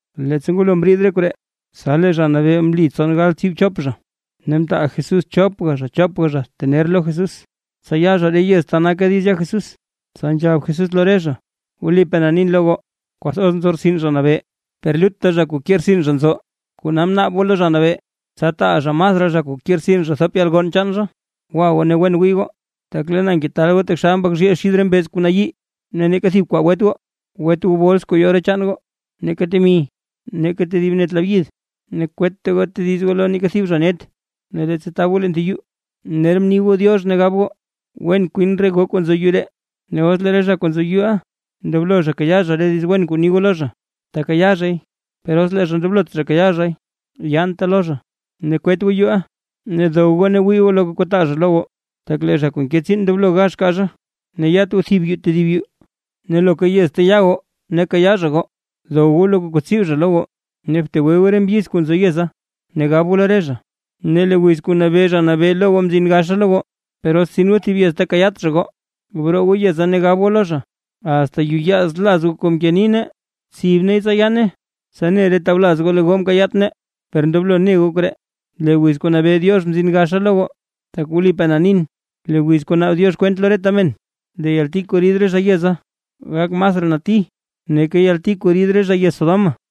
Leettsa ngwalo mriid re koree, tsa lee Zha Nabee mli tson galbtsii chop zha, ne mtaal Jesús chopga chopga zha tener lo Jesús, tsa ya zha re yez ta naka diiz ya Jesús. Tsa nzhab Jesús lo re zha: ―Wlipaa na nin lo goo, kwathoz nzo rtsin Zha Nabee, per lutta zha kuu ke rtsin zha nzo. Kona bnaab goo lo Zha Nabee, tsa taal zha masraa zha kuu ke rtsin zha thop yalgonn chaan zha. Gwa goo, ne wen wii goo, tak lee na ngetaal goo taxal mbak zhiil xid re mbeez kuu nayii. Ne neeka thib kwaa gwet goo, gwet goo bols kuu yo re chaan goo, neeka temi, neeka tedib net labyid, ne kwetta goo tediz goo lo neeka thib zha net. Ne leettsa tab goo leen thib yuu, ner bni goo “diox” gab goo: “Wen kwin re goo kuu nzo yuu ree”. Ne os lee re zha kuu nzo yuuʼa ndoblo zha kayaa zha re diiz wen kuu ni goo lo zha, tekayaa zhay, per os lee zha ndoblot zha kayaa zhay yaante lo zha. Ne kwet goo yuuʼa, ne dow goo ne gwii goo loka kuu taa zha lo goo, tak lee zha kuu nke tsiin ndoblo gax kaa zha. Ne yat goo thib yuu tedib yuu. Ne loka yez ta ya goo ne kayaa zha goo, dow goo loka kuu tsib zha lo goo, ne btegwe goo re mbyiz kuu nzo yeza, ne gab goo lo re zha: “Lee wiz kuu nabee Zha Nabee lo goo mzin gaxa lo goo”. Per os tsin goo thib yez ta kayaat zha goo, broo goo yeza ne gab goo lo zha: “¡Asta yuyaaz laz goo kuu mke nii nee, tsib neey tsa yaane! Tsa ne re tawlaz goo lee goo mkayaat nee. Per ndoblo ne goo koree: Lee wiz kuu nabee Diox mzin gaxa lo goo.” Tak wlipaa na nin, lee wiz kuu naab Diox kwent lo reta men, lee yalti kuu rid re zha yeza, gak masraa nati nake yalti kuu rid re zha yez Sodoma.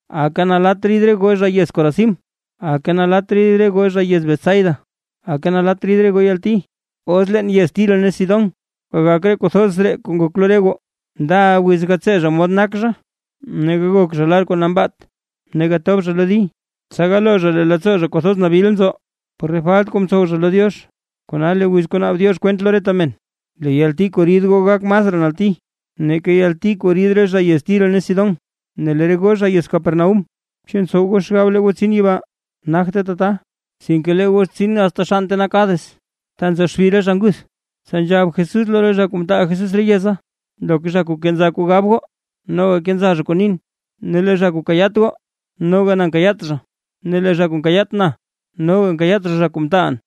’¡Aka nalatt rid re goo zha yez Corazín! ¡Aka nalatt rid re goo zha yez Betsaida! ¡Aka nalatt rid goo yalti! Os leen yez Tiro ne Sidón gagak re kuu thoz ree kuu ngok lo re goo, ndaʼa wiz gatsee zha mod nak zha ne gagok zha lar kuu nambaat ne gatob zha lo di, tsa galoo zha lee leettsoo zha kwathoz nabil nzo por re falt kuu mtsow zha lo Diox. Kona lee wiz kuu naab Diox kwent lo reta men, lee yalti kuu rid goo gak masraa nati, nake yalti kuu rid re zha yez Tiro ne Sidón. Ne lee re goo zha yez Capernaúm, ¿chu ntsow goo xgab lee goo tsin yibaa? ¡Nagte tata, sinke lee goo tsin asta xann ta nak Hades ta nzo xbi re zha nguth! Tsa nzhab Jesús lo re zha kuu mtaal Jesús re yeza: ―Loka zha kuu kenza kuu gab goo, noga kenza zha kuu nin; ne lee zha kuu kayaat goo noga na nkayaat zha, ne lee zha kuu nkayaat na noga nkayaat zha, zha kuu mtaalʼn.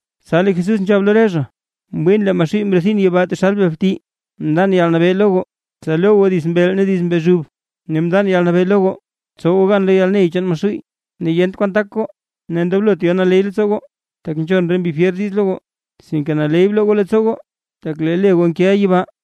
Tsa lee Jesús nzhab lo re zha: ―Mwiin lee Maxuuy mrethin yibaa taxal bel bti. ’Mndan yalnabee lo goo, tsa lo goo dits mbeel ne dits mbezhub, ne mndan yalnabee lo goo tsow goo gan lo yalney chaan Maxuuy, ne yent kwan tak goo. Ne ndoblot yo naley leettsoo goo, tak nzhon re mbi fyer diiz lo goo, sinke naley bloo goo leettsoo goo, tak lee le goo nkeʼa yibaa.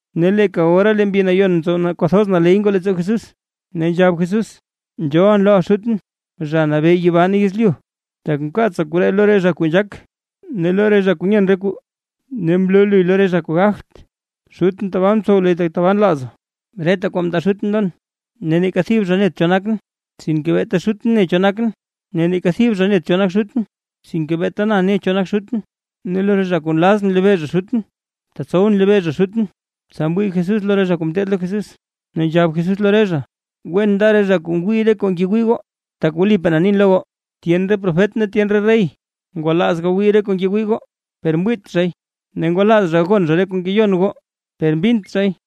Ne leeka ora lee Mbi Nayon mtsow kwathoz naley ngoo leettsoo Jesús, ne nzhab Jesús: ―Nzhoolʼn loʼa Xutʼn, Zha Nabee yibaa ne yezlyu, tak mkaatsa koree lo re zha kuu nzhaak, ne lo re zha kuu nyen re kuu, ne mloo luy lo re zha kuu gagt. Xutʼn tabaa mtsow luy tak tabaa nlaaza. ’Reta kwaa mndaa Xutʼn lon. Ne neeka thib zha net cho nakʼn, sinke beeta Xutʼn ne cho nakʼn. Ne neeka thib zha net cho nak Xutʼn, sinke beeta na ne cho nak Xutʼn, ne lo re zha kuu nlazʼn lebee zha Xutʼn, tetsowʼn lebee zha Xutʼn. Tsa mwii Jesús lo re zha kuu ngeteed lo Jesús, ne nzhab Jesús lo re zha: ―Wen nda re zha kuu ngwii re kuu ngwii goo. Tak wlipaa na nin lo goo, tyen re profet ne tyen re rey ngwalaaz gagwii re kuu ngewii goo, per mwiit zhay, ne ngwalaaz zha gagon zha re kuu ngeyon goo per mbint zhay.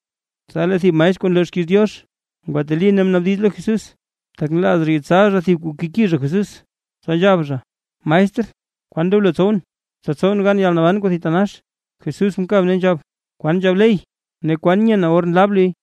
Tsa lee thib maestr kuu nloo xkiiz Diox, ngwateli ne mnaabdiz lo Jesús, tak nlaaz zha yetsal zha thib kuu keki zha Jesús, tsa nzhab zha: ―Maestr, ¿kwan ndoblo tsowʼn, tsa tsowʼn gan yalnaban kuu thitanax? Jesús mkab ne nzhab: ―¿Kwan nzhab ley? ¿Ne kwan nyena or nlab luy?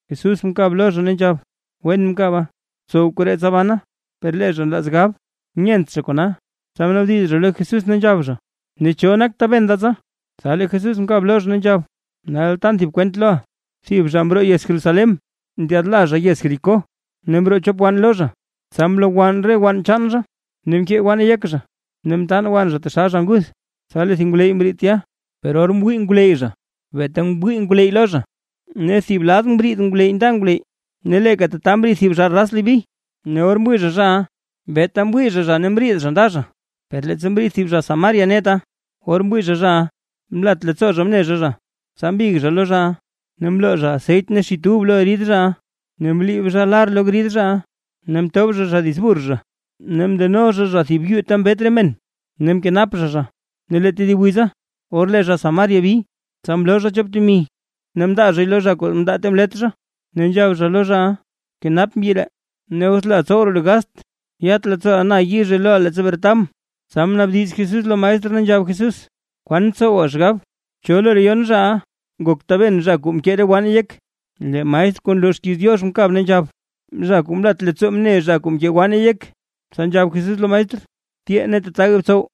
Jesús mkab lo zha, ne nzhab: ―Wen mkaba, btsow koree tsa bana. Per lee zha nlaaz gab, nyent zha kona, tsa mnaabdiz zha lo Jesús, ne nzhab zha: ―¿Ne cho nak taben da tsa? Tsa lee Jesús mkab lo zha, ne nzhab: ―Nal tan thib kwent loʼa. Thib zha mroo yez Jerusalén ndyaadla zha yez Jericó, ne mroo chop tson wann lo zha, tsa mlowann re wann chaan zha; ne mkee wanne yek zha ne mtaan wann zha taxal zha nguth. Tsa lee thib ngwleyy mriid tya. Per or mwii ngwleyy zha, beeta mwii ngwleyy lo zha, ne thib lad mriid ngwleyy nda ngwleyy. Ne leeka tata mriid thib zha raz Leví, ne or mwii zha zhaʼa, beeta mwii zha zha, ne mriid zha nda zha. Per leettsa mriid thib zha Samaria neta, or mwii zha zhaʼa, mlat leettsoo zha mne zha zha. Tsa mbig zha lo zhaʼa, ne mloo zha aseyt ne xit ub lo grid zhaʼa, ne mliib zha lar lo grid zhaʼa. Ne mtob zha zha dits burr zha, ne mndeno zha zha thib yuu ta mbet re men ne mkenap zha zha. Ne lee tedib wiza or lee zha Samaria mbi, tsa mloo zha chop temi, ne mndaa zhay lo zha kuu mndaa ta mlet zha, ne nzhab zha lo zhaʼa: “Bkenap mbyi ree, ne os leeʼa tsow raa lu gast, yat leettsooʼa na yizhe loʼa leettsa bretabʼn”. Tsa mnaabdiz Jesús lo maestr, ne nzhab Jesús: ―¿Kwan ntsowa xgab? ¿Cho lo re yon zhaʼa nak taben zha kuu mkee re wanne yek? Lee maestr kuu nloo xkiiz Diox mkab, ne nzhab: ―Zha kuu mlat leettsoo mne zha kuu mkee wanne yek. Tsa nzhab Jesús lo maestr: ―Tyee, ne tataga btsow.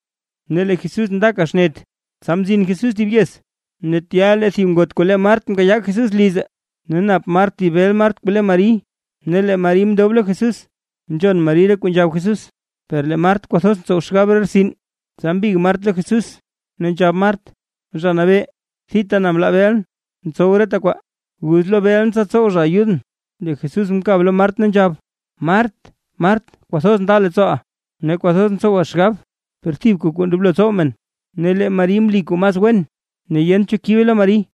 Ne lee Jesús ndaka xnet, tsa mzin Jesús thib yez, ne tya lee thib ngot kuu le Mart mkayaa Jesús lize. Ne nap Mart thib bel Mart kuu le Mari. Ne lee Mari mndob lo Jesús, nzhon Mari re kuu nzhab Jesús. Per lee Mart kwathoz ntsow xgab re rtsin, tsa mbig Mart lo Jesús, ne nzhab Mart: ―Zha Nabee, thita na mlaa belʼn, tsow reta kwaa. Guz lo belʼn tsa tsow zha ayudʼn. Lee Jesús mkab lo Mart, ne nzhab: ―Mart, Mart, kwathoz nda leettsooʼa, ne kwathoz ntsowa xgab, per thibka kuu ndoblo tsow men ne lee Mari mli kuu mas wen, ne yent cho kibe lo Mari.